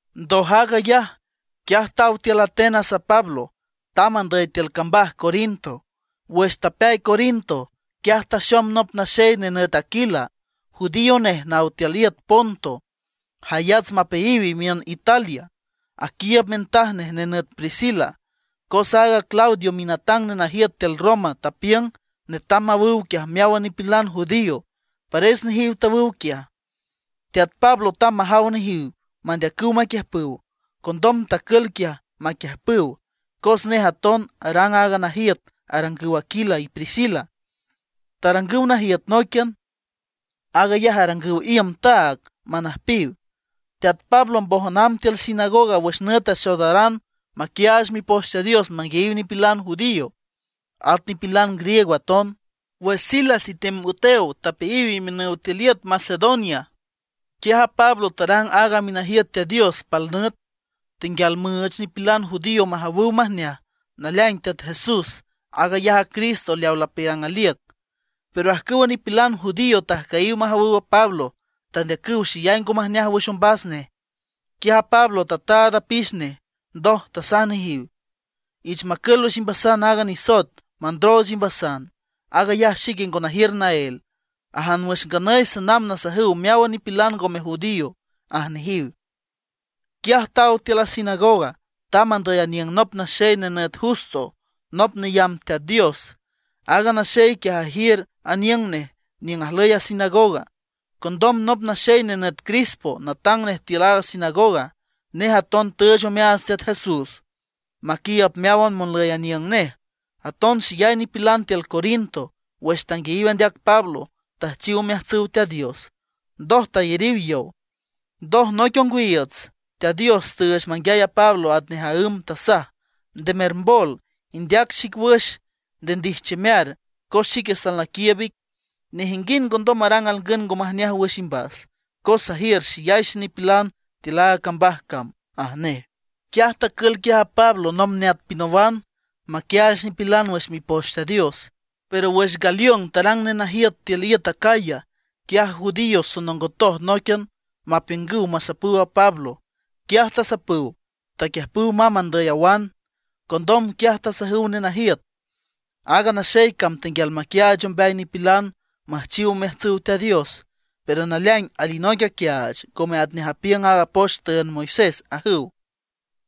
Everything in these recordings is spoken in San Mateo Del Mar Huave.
Ndoj aag ayaj, quiaj taw tiül Atenas a Pablo, tamb andüy tiül cambaj Corinto. Wüx tapeay Corinto, quiaj taxom nop naxey nenüt Aquila, judío nej naw tiül iüt Ponto, jayats mapeayiw imiün Italia, aquiiüb mintaj nej nenüt Priscila. Cos aaga Claudio minatang nenajiüt tiül Roma, tapiüng netam mawüw quiaj meáwan nipilan judío, pares nejiw tawüw quiaj. Teat Pablo tamb majaw nejiw mandeacüw maquiüjpüw. Condom tacül quiaj maquiüjpüw, cos nej aton arang aaga najiüt arangüw Aquila y Priscila, tarangüw najiüt nóiquian; aag ayaj arangüw iüm taag manüjpiw. Teat Pablo mbójan amb tiül sinagoga wüx nüt axoodaran maquiaach Mipoch Teat Dios manguiayiw nipilan judío, at nipilan griego aton. Wüx Silas y Timoteo tapeayiw imiünüw tiül iüt Macedonia, quiaj a Pablo tarang áagan minajiüt Teat Dios pal nüt. Tenguial müüch a nipilan judío majawüw majneaj naleaing Teat Jesús, aag ayaj a Cristo leawa lapiürang aliüc. Pero ajcüwa nipilan judío tajcüyiw majawüw a Pablo; tandeacüw xeyay ngo majneaj wüx ombas nej. Quiaj a Pablo tataad apix nej, ndoj tasaj nejiw: ―Ich macül wüx imbasan aaga nisoet mandrooch imbasan, aag ayaj xique ngo najiür naél. Ajan wüx nganüy sanamb nasajüw meáwan nipilan ngome judío ―aj nejiw. Quiaj taw tiül a sinagoga, tamb andüy aniüng nop naxey nenüt Justo, nop neyamb Teat Dios. Aaga naxey quiaj ajiür aniüng nej niüng ajlüy a sinagoga. Condom nop naxey nenüt Crispo, natang nej tiül a sinagoga, nej aton tüüch omeaats Teat Jesús maquiiüb meáwan monlüy aniüng nej. Aton xeyay nipilan tiül Corinto wüx tanguiayiw andeac Pablo, tüjchiw omeajtsüw Teat Dios, ndoj tayariw yow. Ndoj, noic ongwiiüts Teat Dios tüüch manguiay a Pablo atnej maǘm, tasaj: ―Nde mermbol, indeac xic wüx, nde ndijchiümear. Cos xique salnaquiiüb ic, nejinguind ngondom marang alngün ngo majneaj wüx imbas. Cos sajiür xeyay xenipilan tiül aaga cambaj cam ―aj nej. Quiaj tacül quiaj a Pablo nomb neat pinawan, maquiaach nipilan wüx Mipoch Teat Dios. Pero wüx Galión tarang nenajiüt tiül iüt Acaya, quiaj a judíos sonongotoj nóiquian mapiüngüw masapüw a Pablo. Quiaj tasapüw, taquiüjpüw mamb andüy awan. Condom quiaj tasajüw nenajiüt: ―Aaga naxey cam tenguial maquiaach ombeay nipilan müjchiw omeajtsüw Teat Dios, pero naleaing alinoic aquiaach, ngome atnej apiüng aaga poch tüünd Moisés ―ajüw.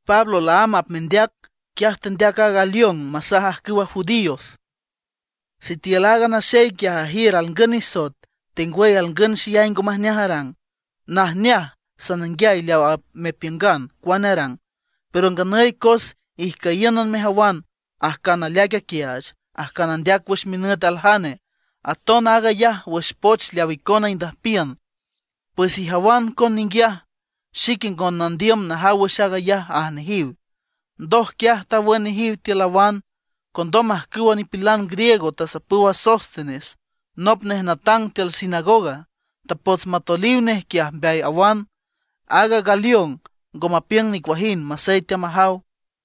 Pablo laámb apmendeac, quiaj tendeac a Galión masaj ajcüwa judíos: ―Sitiül aaga naxey quiaj ajiür alngün nisoet, tengwüy alngün xeyay ngo majneaj arang, najneaj sananguiay leaw apmepiüngan cuane arang. Pero nganüy cos ijcüyíünan mejawan ajcan aleaic aquiaach, ajcan andeac wüx minüt aljane, aton aag ayaj wüx poch leaw icona indüjpiün; pues ijawan coen ninguiaj, xique ngo nandiüm najaw wüx aag ayaj ―aj nejiw. Ndoj quiaj tawün nejiw tiül awan. Condom ajcüwa nipilan griego tasapüw a Sóstenes, nop nej natang tiül sinagoga. Tapots matoeliw nej quiaj mbeay awan. Aaga Galión ngo mapiüng nicuajind, masey teamajaw.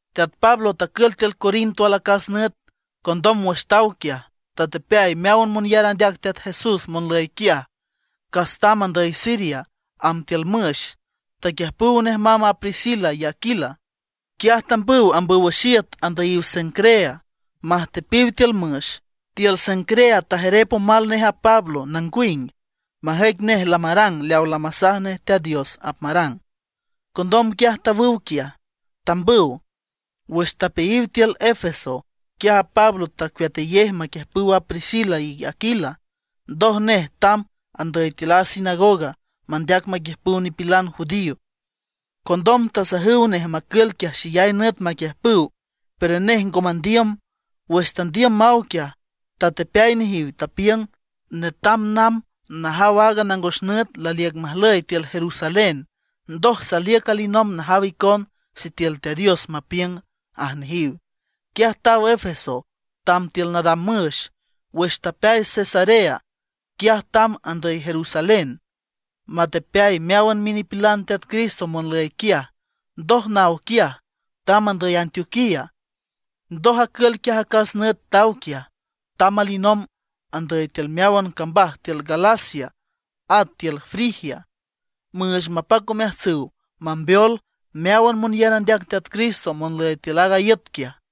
Teat Pablo tacül tiül Corinto alacas nüt, condom wüx taw quiaj, tatepeay meáwan monyar andeac Teat Jesús monlüy quiaj, cas tamb andüy Siria amb tiül müx, taquiüjpüw nej mamb a Priscila y Aquila. Quiaj tambüw ambüw wüx iüt andüyiw Cencrea majtepiw tiül müx. Tiül Cencrea tajerep omal nej a Pablo nangwing, majüic nej lamarang leawa lamasaj Teat Dios apmarang. Condom quiaj tawüw quiaj, tambüw. Wüx tapeayiw tiül Éfeso, quiaj a Pablo tecueatayej maquiüjpüw a Priscila y Aquila. Ndoj nej tamb andüy tiül a sinagoga, mandeac maquiüjpüw nipilan judío. Condom tasajüw nej macül quiaj xeyay nüt maquiüjpüw, pero nej ngo mandiüm. Wüx tandiüm maw quiaj, tatepeay nejiw, tapiüng: ―Netam namb najaw aaga nangos nüt laliüc majlüy tiül Jerusalén. Ndoj saliüc alinomb najaw icon sitiül Teat Dios mapiüng ―aj nejiw. Quiaj taw Éfeso amb tiül nadam müx. Wüx tapeay Cesarea, quiaj tamb andüy Jerusalén, matepeay meáwan minipilan Teat Cristo monlüy quiaj. Ndoj naw quiaj, tamb andüy Antioquía. Ndoj acül quiaj acas nüt taw quiaj, tamb alinomb andüy tiül meáwan cambaj tiül Galacia, at tiül Frigia, müüch mapac omeajtsüw mambeol meáwan monyar andeac Teat Cristo monlüy tiül aaga iüt quiaj.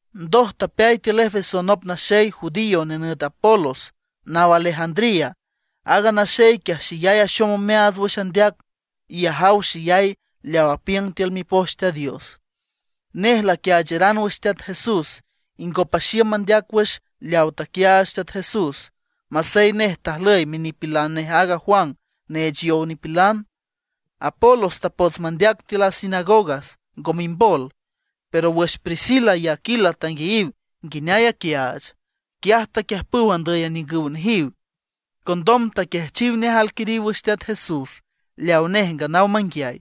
Ndoj tapeay tiül Éfeso nop naxey judío nenüt Apolos naw Alejandría. Aaga naxey quiaj xeyay axom omeaats wüx andeac, y ajaw xeyay leaw apiüng tiül Mipoch Teat Dios. Nej laquiaacharan wüx Teat Jesús, y ngo paxiüm mandeac wüx leaw taquiaach Teat Jesús, masey nej tajlüy minipilan nej aaga Juan neech yow nipilan. Apolos tapots mandeac tiül a sinagoga ngo mimbol; pero wüx Priscila y Aquila tanguiayiw nguineay aquiaach, quiaj taquiüjpüw andüy aniüngüw nejiw. Condom taquiajchiw nej alquiriw wüx Teat Jesús leaw nej nganaw manguiay.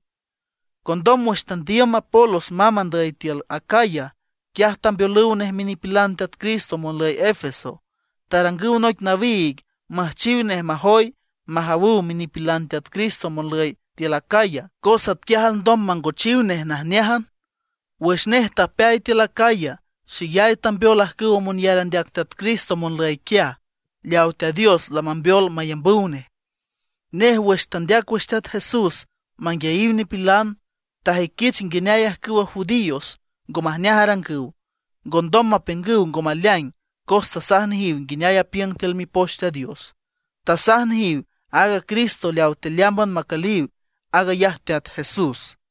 Condom wüx tandiüm Apolos mamb andüy tiül Acaya, quiaj tambeolüw nej minipilan Teat Cristo monlüy Éfeso. Tarangüw noic nawiig müjchiw nej majoy, majawüw minipilan Teat Cristo monlüy tiül Acaya, cos atquiaj alndom mangochiw nej najneájan. Wüx nej tapeay tiül Acaya, xeyay tambeol ajcüw monyar andeac Teat Cristo monlüy quiaj, leaw Teat Dios lamambeol mayambüw nej. Nej wüx tandeac wüx Teat Jesús manguiayiw nipilan, tajüiquich nguineay ajcüwa judíos ngo majneaj arangüw. Ngondom mapiüngüw ngo maleaing cos tasaj nejiw nguineay apiüng tiül Mipoch Teat Dios. Tasaj nejiw aaga Cristo leawa tealeámban macüliw, aag ayaj Teat Jesús.